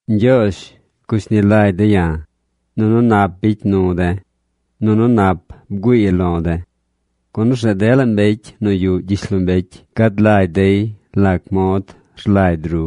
Ñgyoozh, gushni lagy de̱ ya̱, nunu nap bicy nu de̱, nunu nap bgüii lo̱ de̱. Gun orzeꞌ dela mbecy nu yuꞌ gyishlombecy gad lagy dey lac mod rlagy ru.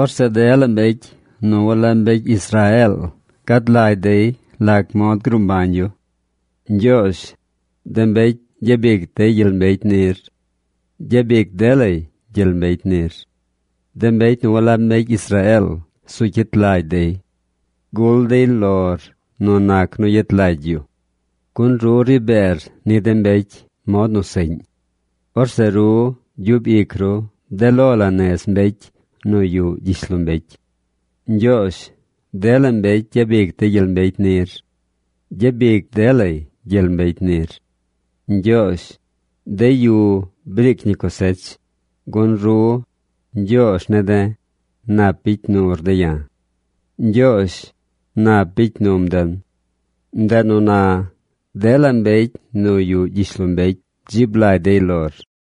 Orzeꞌ dela mbecy nu walab mbecy Israeel gad lagy dey lac mod gruu mbañ yu. Ñgyoozh, de mbecy gyabic dey gyel mbecy nir. Gyabic delay gyel mbecy nir. De mbecy nu walab mbecy Israeel zu cyit lagy dey. Gul dey lor nu nac nu yet lagy yu. Gun ru ri beer ni de mbecy mod nu seꞌñ. Orzeꞌ ru gyub ic ru de lo la nez mbecy nu yuꞌ gyishlombecy. Ñgyoozh dela mbecy gyabic dey gyel mbecy nir. Gyabic delay gyel mbecy nir. Ñgyoozh, de yu briic ñi cosech, gun ru, Ñgyoozh ne̱ de̱, nap bicy nur de̱ ya̱. Ñgyoozh, nap bicy num den. Ndeꞌ nu na dela mbecy nu yuꞌ gyishlombecy dzib lagy dey lor.